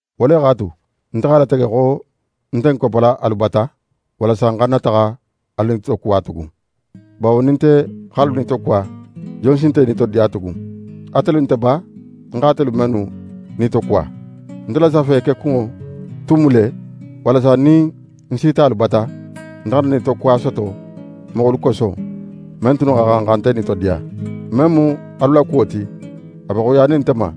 Wo le x'a tu, nte x'a latege xo ń nte ń koppala alu bata, walasa ń xana taxa alu nitokuwa tugun. Bawo nin nte x'alu nitokuwa, jon si nte nitodiya tugun? Atelu nte ba, ń xa atelu mennu nitokuwa? Nte la safe kekunŋo tun mu le, walasa nin ń sita alu bata, nte xana nitokuwa soto moxolu koso, men tunnu xa xan xa nte nitodiya. Men mu alu la kuwo ti, a be xoyiyanin nte ma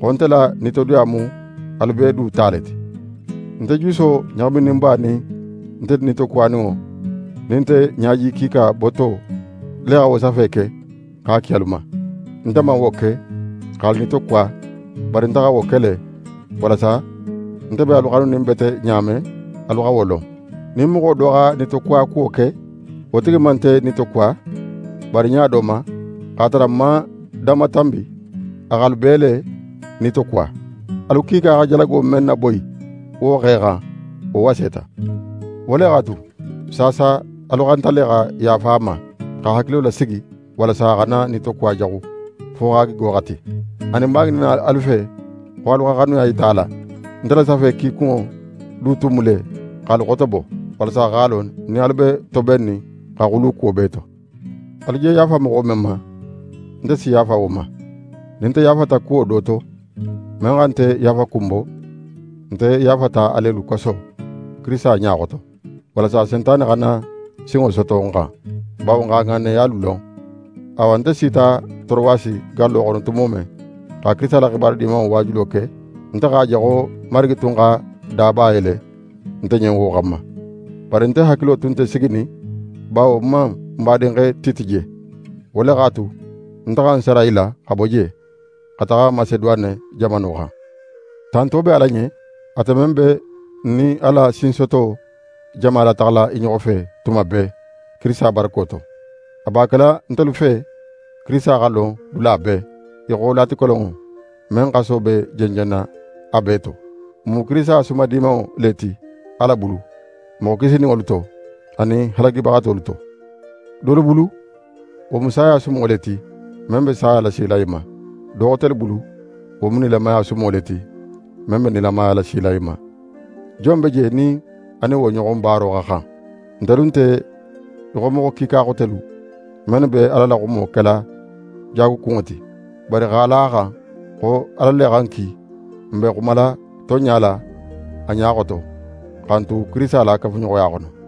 xo nte la nitodiya mu alu bee du ta le ti. Nte juso ɲaxamininba nin nte nitokuwaninŋo nin nte ɲaji kiika boto le xa wo safe ke x'a ki alu ma. Nte man wo ke x'alu nitokuwa, bari nte xa wo ke le, walasa nte be alu xanunin bete ɲa men, alu xa wo lon. Nin moxo do xa nitokuwa kuwo ke, wo tigi man nte nitokuwa, bari ɲa do ma, x'a tara n man danmatanbi, a x'alu bee le nitokuwa. Alu kiika xa jalago men naboyi wo xe xan, wo waseta. Wo le x'a tu, saasa alu xanta le xa yaafa a ma, x'a hakilo lasigi, walasa a xana nitokuwa jaxu, fo x'a gigo xati. Anin, ń b'a ŋininna alu fe, xo alu xa xanuya yita a la. Nte la safe kikunŋo du tun mu le x'alu xotobo, walasa x'a lon nin alu be tobennin xa xulu kuwo bee to. Alu je yaafa moxo men ma, nte si yaafa wo ma. Nin nte yaafata kuwo do to, men xa nte yaafakun bo, nte yaafata alelu koso, Kirisita ɲa xoto; walasa Sentane xana sinŋo soto n xan. Bawo n x'a ŋanneyalu lon. Awa, nte sita Torowasi gallo xono tumo men, xa Kirisita la xibaru Dimanŋo waajulo ke, nte x'a je xo Marigi tun xa daba yele nte ɲen wo xanma. Bari nte hakilo tun nte siginin, bawo ń man ń badinxe Tite je. Wo le x'a tu, nte xa ń sara i la xa bo je, xa taxa Maseduwane jamano xan. Tanto be Ala ɲen, ate men be n nin a la sinsoto jama lataxala i ɲoxo fe tuma bee, Kirisita barako to. A b'a kela ntelu fe Kirisita xa lon dula bee, í xo latikolonŋo men xaso be jenjenna a bee to. Ń mu Kirisita sumadimanŋo le ti Ala bulu, moxo kisininŋolu to, anin halagibaxatolu to. Dolu bulu, wo mu saya sumo le ti, men be saya lasila i ma. Do xotelu bulu, wo mu nilamaya sumo le ti, men be nilamaya lasila i ma. Jon be je nin a nin wo ɲoxon baaro xa xan? Ntelu nte í xo moxo kiika xotelu, mennu be Ala la xumo kela jaagukunŋo ti. Bari x'a la a xan xo Ala le xa n ki, n be xumala tonɲa la a ɲa xoto, xa n tu Kirisita la kafuɲoxoya xono.